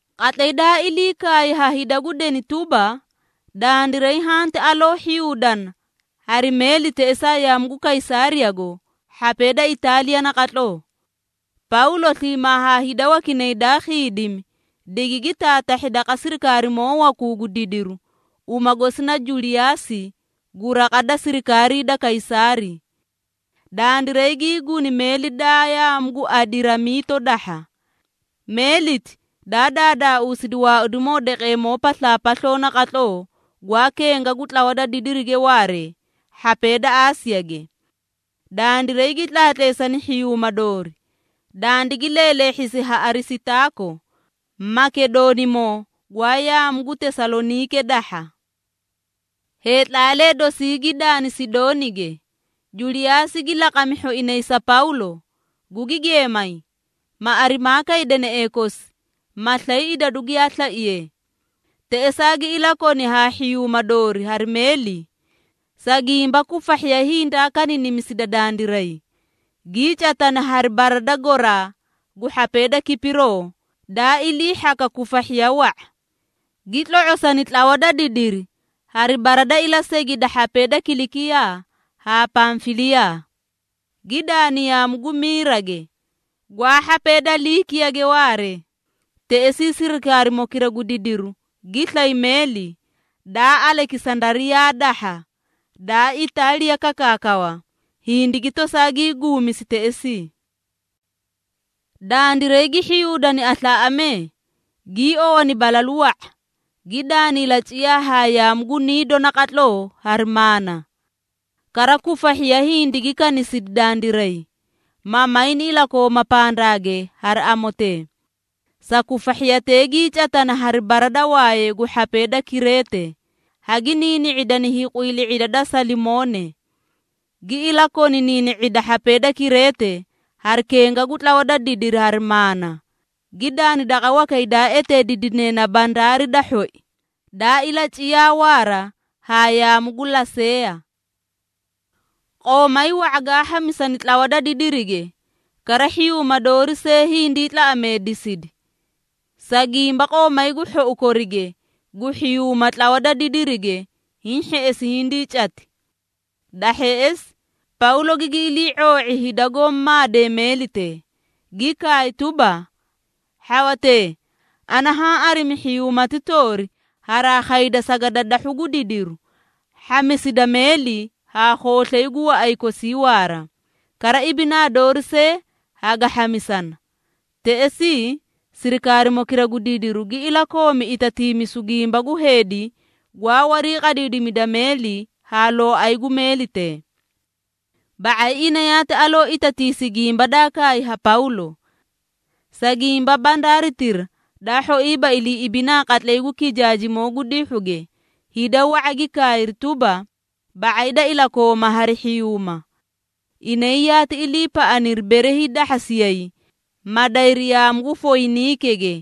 Qatlay daa ilii kaay ha hida gu deni tuba, dandiray hanti aloo hhiyuudana hari meeli teꞌesaa yaamu gu Kaysaariyago hhapee da Itaaliya naqatloo. Pawlo sliimaa haa hida wakinay daa khiidimi, digigi taatahhi daqa sirikaarimoo wakuu gu didiru, uma gosi na Juliyaasi gu raqa da sirikaarii da Kaysaari. Dandiray gii guni meeli daa yaamu gu Adiramiito dahha. Meeliti, daa daadaausidi waaudimoo daqeemoo paslaapasloo naqatloo, gwaa kenga gu tlawa da didirige waaree hhapee da Aasiyage. Dandiray gi tlaatleesani hhiyuuma doori, dandigi leeleehhisi ha Arisitaako, Makedoonimoo gwaa yaamu gu Tesaloniike dahha. Heetlaalee dosii gi daani Sidoonige. Juliyaasi gi laqami hhoinay sa Pawlo, gugi geemay, ma arimaa kay deneꞌee kosi, ma slay idadu giyaa slaiye. Teꞌesaa gi ilakoni haa hhiyuuma doori hari meeli. Sa gimba kufahhiya hindaa kaniinimisida dandiray, gii catani hari bara da goraa gu hhapee da Kipiroo daa ilii hhaka kufahhiya wa⁄a. Gi tlo⁄osani tlawa da didiri hari bara da ilasegi da hhapee da Kilikiyaa haa Pamfiliyaa, gi daani yaamu gu Miirage, gwaa hhapee da Liikiyage waaree. Teꞌesii sirikaarimokira gu didiru gi slay meeli, daa Alekisandariyaa dahha, daa Itaaliya kakaakawa, hindigi tosaa gii guumisi teꞌesii. Dandiray gi hhiyuudani aslaaꞌamee, gii owani balalu wa⁄a, gi daani ilaciyaa haa yaamu gu Niido naqatloo hari maana. Kara kufahhiya hindigi kanisidi dandiray, ma mayni ilakooma pandaage hari amotee. Sa kufahhiyatee gii catani hari bara da wayee gu hhapee da Kireete, hagi niini⁄idani hiiqwiilii⁄ida da Salimoone. Gi ilakoni niini⁄ida hhapee da Kireete hari kenga gu tlawa da didiri hari maana, gi daani daqa wakay daa eteediidine na “Bandaari da hhoi” daa ilaciyaa waara haa yaamu gu Laseeya. Qoomay wa⁄a gaã hhamisani tlawa da didirige, kara hhiyuuma doori see hindii tlaꞌameedeesidi, sa gimba qoomay gu hhou korige gu hhiyuuma tlawa da didirige hiĩ hheꞌesi hindii cati. Da hheꞌesi Pawlo gigi ilii⁄oo⁄i hida goó maadee meelitee, gi kaay tuba, “Hhawatee, ana haã arimi hhiyuumati toori haraa khayda sagadadahhu gu didiru, hhamisida meeli haa khooslay gu waꞌay kosii waara, kara ibinaa doori see haga hhamisana.” Teꞌesii, sirikaarimokira gu didiru gi ilakoomi itatiimisu gimba gu heedi gwaa wariiqadiidimida meeli haa looay gu meelitee. Ba⁄ay ina yaati aloo itatiisi gimba daa kaay ha Pawlo. Sa gimba bandaaritira daa hhoiiba ilii ibinaa qatlay gu kijaajimoo gu dihhuge, hida wa⁄a gi kaayri tuba, ba⁄ay da ilakooma hari hhiyuuma. Inay yaati iliipaꞌaniri bere hiidahhasiyay, ma dayri yaamu gu Foyiniikege,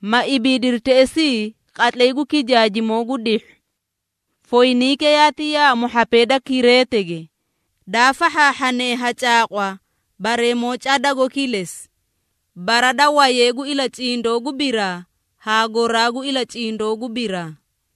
ma ibiidiri teꞌesii qatlay gu kijaajimoo gu dihhu. Foyiniike yaati yaamu hhapee da Kireetege, daa fahhaahhane ha caaqwa bareemoo cadago kilesi, bara da Wayee gu Ilacindoo gu biraa haa Goraa gu Ilacindoo gu biraa.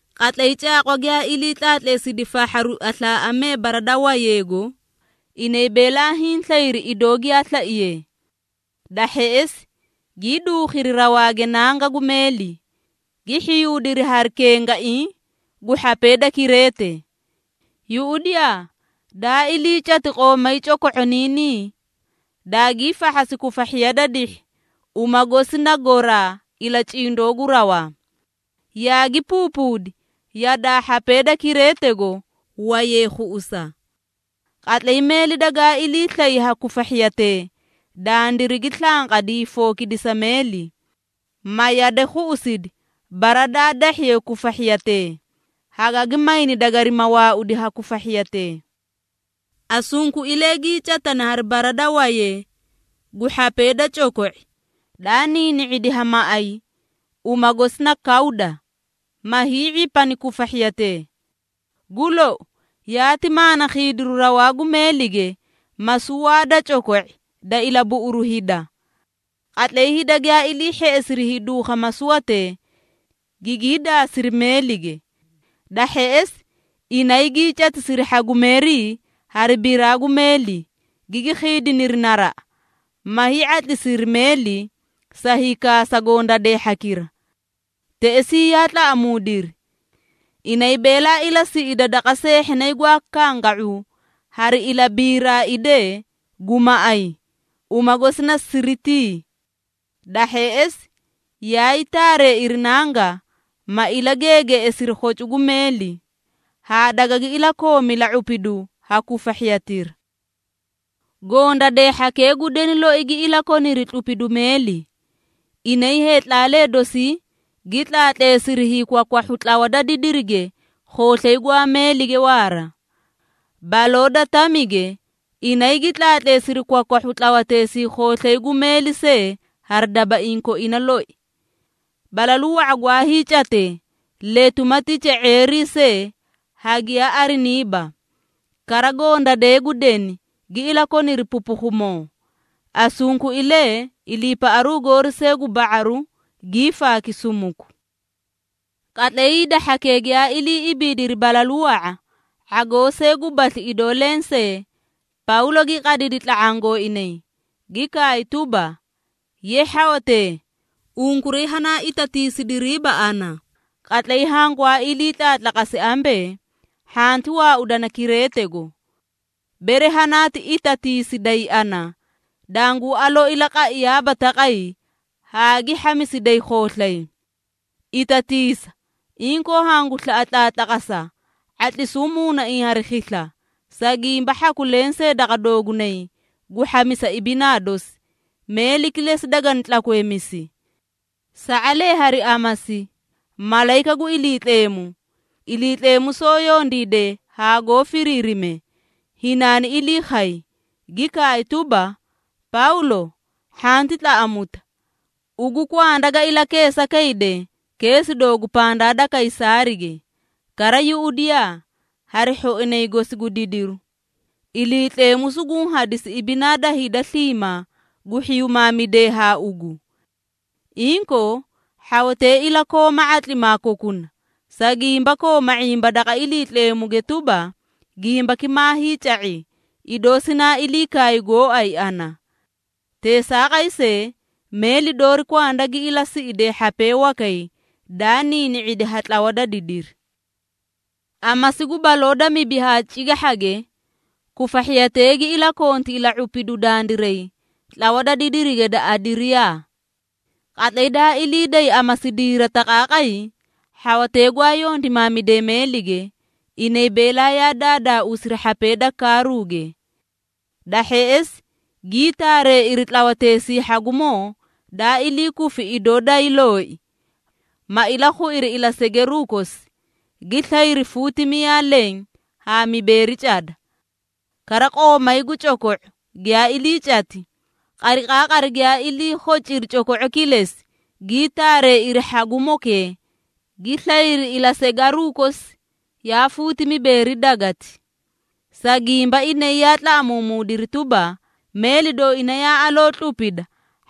Qatlay caaqwa giyaa ilii tlaatleesidi fahharu aslaaꞌamee bara da wayeego, inay beelaa hiĩ slayri idoo giyaa slaiyee. Da hheꞌesi gii duukhiri rawaage nanga gu meeli, gi hhiyuudiri hari kengaiĩ gu hhapee da Kireete. Yuꞌudiyaa, daa ilii cati qoomay coko⁄oniinii, daagii fahhasi kufahhiya da dihhi, uma gosi na “Goraa - Ilacindoo gu rawaa,” yaagi puupuudi yadaa hhapee da Kireetego wayee khuꞌusa. Qatlay meeli dagaa ilii slay ha kufahhiyatee, dandirigi slanqadi hiifokidisa meeli, ma yade khuꞌusidi bara daa dahhiye kufahhiyatee, hagaga mayni dagarima waaudi ha kufahhiyatee. Asunkuilee gii catani hari bara da wayee gu hhapee da coko⁄i, daa niini⁄idi ha maꞌay, uma gosi na Kawda, ma hii⁄ipani kufahhiyatee. Gu lou, yaati maana khiidiru rawaa gu meelige masuwaa da coko⁄i da ilabuꞌuru hida. Qatlay hida giyaa ilii hheꞌesiri hiiduukha masuwatee, gigii daasiri meelige. Da hheꞌesi, inay gii catisiri hhagumeerii hari biraa gu meeli, gigi khiidiniri naraꞌa, ma hii⁄atlisiri meeli sa hiikaasa gondadee hhakira. Teꞌesii yaa tlaꞌamuudiri, inay beelaa ilasiꞌida daqa seehhinay gwaa kanga⁄u hari ilabiiraidee gu maꞌay, uma gosi na Siritii. Da hheꞌesi, yaay taareeiri nanga, ma ilageegeeꞌesiri khocu gu meeli, haa dagagi ilakoomi ila⁄upidu ha kufahhiyatira. Gondadee hhakee gu deni loi gi ilakoniri tlupidu meeli. Inay heetlaalee dosii gi tlaatleesiri hiikwakwahhu tlawa da didirige khooslay gwaa meelige waara. Baloo da tamige, inay gi tlaatleesiri kwakwahhu tlawateesii khooslay gu meeli see hari dabaiĩ koina loi. Balalu wa⁄a gwaa hiicatee letu ma tica⁄eerii see hagiyaa ariniiba, kara gondadee gu deni gi ilakoniri pupukhumoo. Asunkuilee iliipaꞌaru goori see gu ba⁄aru, gii faaki sumuku. Qatlay hida hhakee giyaa ilii ibiidiri balalu wa⁄a, ⁄agoo see gubasli idoo lensee, Pawlo gi qadidi tla⁄aã gooinay, gi kaay tuba, “Ye hhawatee, unkuray hanaa itatiisidiriiba ana, qatlay hangwaa ilii tlaatlaqasi ambee, hhanti waaudana Kireetego. Bere hanaati itatiisiday ana, danguu aloo ilaqaiyaaba taqay haa gi hhamisiday khooslay. Itatiisa, inkoo hangu slaꞌa tlaatlaqasa, ⁄atlisuu muunaiĩ hari khisla, sa gimba hhaku lensee daqa doogunay gu hhamisa ibinaa dosi, meeli kilesi dagani tlakweemisi. Sa⁄alee hari amasi malayika gu Iliitleemu, Iliitleemu soó yondiide haa goó firiirime, hinaani ilii khay, gi kaay tuba, ‘Pawlo, hhanti tlaꞌamuta. Ugu kwanda ga ilakeesa kayde keesi doogu pandaa da Kaysaarige. Kara yuꞌudiyaa, hari hhoinay gosi gu didiru, Iliitleemu suguũ hadisi ibinaa da hida sliimaa gu hhiyumaamidee haa ugu.’ Inkoo, hhawatee ilakooma ⁄atlimaa kokuna, sa gimba kooma ⁄imba daqa Iliitleemuge tuba, gimbaki maa hiica⁄i, idoo sinaa ilii kaay gooay ana. Teesaaqay see, meeli doori kwanda gi ilasiꞌide hhapee wakay daa niini⁄idi ha tlawa da didiri.” Amasi gu baloo da mibi haa cigahhage, kufahhiyatee gi ilakonti ila⁄upidu dandiray tlawa da didirige da Adiriyaa. Qatlay daa ilii day amasidiira taqaaqay, hhawatee gwaa yondimaamidee meelige, inay beelaa yaa daadaauusiri hhapee da kaaruuge. Da hheꞌesi gii taareeiri tlawateesii hhagumoo daa ilii kufi idoo dayii looi, ma ilakhuiri ilasegeruu kosi, gi slayri fuuti miyaa leẽ haa mibeeri cada. Kara qoomay gu coko⁄o giyaa ilii cati, qariqaaqari giyaa ilii khociri coko⁄o kilesi, gii taareeiri hhagumokee, gi slayri ilasegaruũ kosi yaa fuuti mibeeri dagati. Sa gimba inay yaa tlaꞌamuumuudiri tuba, meeli dooina yaa aloo tlupita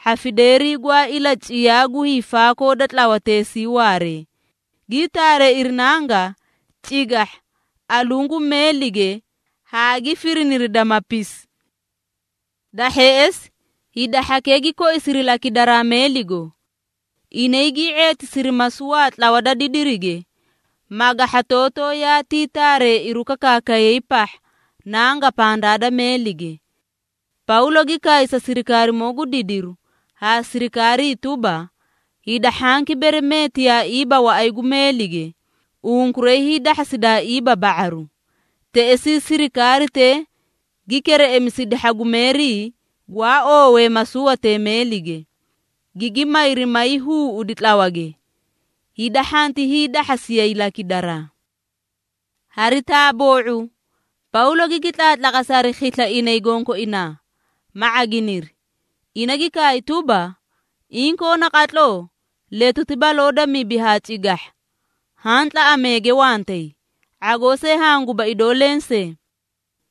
hhafideerii gwaa ilaciyaa gu hiifaakoo da tlawateesii waaree, gii taareeiri nanga cigahha aluũ gu meelige haa gi firiniri damapisi. Da hheꞌesi, hida hhakee gi koisiri lakidaraa meeligo. Inay gii ⁄eetisiri masuwaa tlawa da didirige, magahhatootoo yaatii taareeiru kakaakay pahha nanga pandaa da meelige. Pawlo gi kaay sa sirikaarimoo gu didiru haa sirikaarii tuba, “Hida hhanki bere meetiyaaiiba waꞌay gu meelige, unkuray hiidahhasidaaiiba ba⁄aru.” Teꞌesii, sirikaaritee gi kereꞌemisidi hhagumeerii gwaa oowee masuwatee meelige, gigi mayri may huuꞌudi tlawage, hida hhanti hiidahhasiyay lakidaraa. Hari taaboo⁄u, Pawlo gigi tlaatlaqasi hari khisla inay gonkoinaa, ma ⁄aginiri. Ina gi kaay tuba, “Inkoo naqatloo letuti baloo da mibi haa cigahha haã tlaꞌameege wantay, ⁄agoo see hanguba idoo lensee.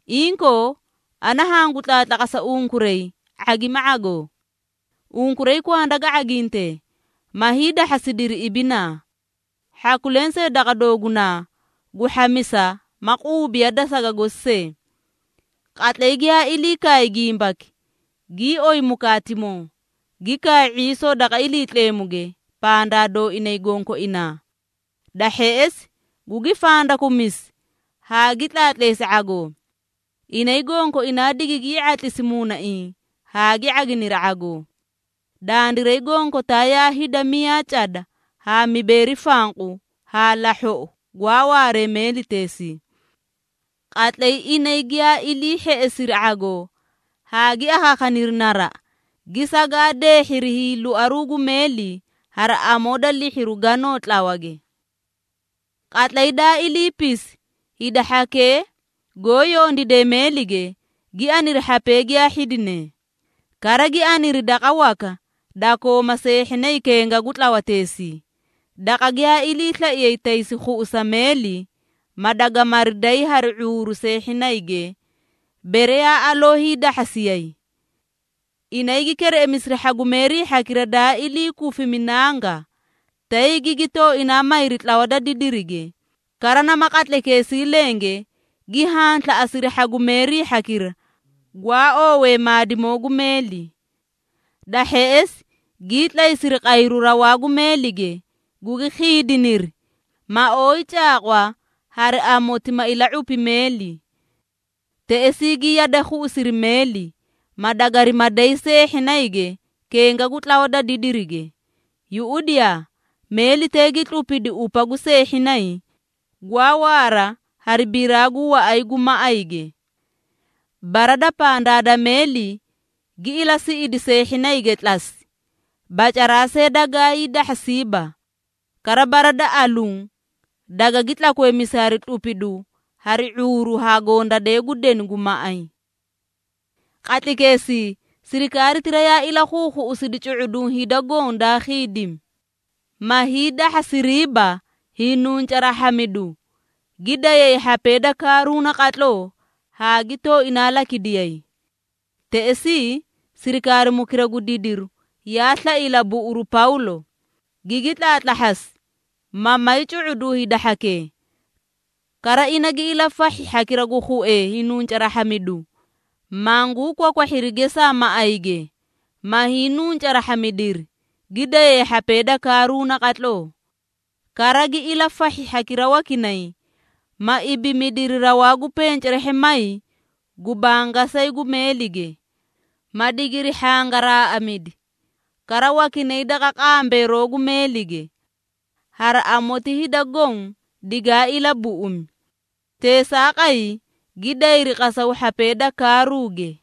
Inkoo, ana hangu tlaatlaqasa unkuray ⁄agima ⁄agoo. Unkuray kwanda ga ⁄agintee, ma hiidahhasidiri ibinaa. Hhaku lensee daqa doogunaa gu hhamisa ma quubiya da saga gosi see.” Qatlay giyaa ilii kaay gimbaki, gii oyi mukaatimoo, gi kaay ⁄iisoo daqa Iliitleemuge pandaa dooinay gonkoinaa. Da hheꞌesi gugi fandakumisi haa gi tlaatleesi ⁄agoo. Inay gonkoinaa digigii ⁄atlisi muunaiĩ haa gi ⁄aginiri ⁄agoo. (Dandiray gonkotaa yaa hida miyaa cada haa mibeeri fanqu haa lahhoꞌo gwaa waaree meeliteesii.) Qatlay inay giyaa ilii hheꞌesiri ⁄agoo haa gi akhaakhaniri naraꞌa, gi sagaadeehhiri hiiloaruu gu meeli, hari amoo da lihhiru ganoo tlawage. Qatlay daa iliipisi, hida hhakee goó yondiidee meelige, gi aniri hhapee giyaa hhidinee. Kara gi aniri daqa waka da kooma seehhinay kenga gu tlawateesii, daqa giyaa iliislaiyee taysi khuꞌusa meeli, ma dagamari day hari ⁄uuru seehhinayge, bere yaa aloo hiidahhasiyay. Inay gi kereꞌemisiri hhagumeerii hhakira daa ilii kufimi nanga, tay gigi tooinaa mayri tlawa da didirige, kara nama qatlaykeesii lenge gi hanslaꞌasiri hhagumeerii hhakira gwaa oowee maadimoo gu meeli. Da hheꞌesi gii tlaysiri qayru rawaa gu meelige, gugi khiidiniri, ma ooyi caaqwa hari amoti ma ila⁄upi meeli. Teꞌesii gi yade khuꞌusiri meeli, ma dagarima day seehhinayge kenga gu tlawa da didirige. Yuꞌudiyaa, meelitee gi tlupidi upa gu seehhinay, gwaa waara hari biraa gu waꞌay gu maꞌayge. Bara da pandaa da meeli gi ilasiꞌidi seehhinayge tlasi, bacaraa see dagaa hiidahhasiiba. Kara bara da aluũ dagagi tlakweemisi hari tlupidu hari ⁄uuru ha gondadee gu deni gu maꞌay. Qatlaykeesii, sirikaaritira yaa ilakhuukhuꞌusidi cu⁄uduũ hida goõ daa khiidimi, ma hiidahhasiriiba hiinuncaraahhamidu, gi dayay hhapee da kaaruu naqatloo haa gi tooinaa lakidiyay. Teꞌesii, sirikaarimokira gu didiru yaa slai ilabuꞌuru Pawlo, gigi tlaatlahhasi, ma may cu⁄uduũ hida hhakee. Kara ina gi ilafahhi hhakira gu khuee hiinuncaraahhamidu, manguu kwakwahhiri gesaa maꞌayge, ma hiinuncaraahhamidiri, gi dayay hhapee da kaaruu naqatloo. Kara gi ilafahhi hhakira wakinay, ma ibimidiri rawaa gu pencerahhamay gu bangasayi gu meelige, ma digiri hhangaraaꞌamidi, kara wakinay daqa qambeeroo gu meelige. Hari amoti hida goõ digaa ilabuꞌumi. Teesaaqay gi dayri qasaw hhapee da kaaruuge.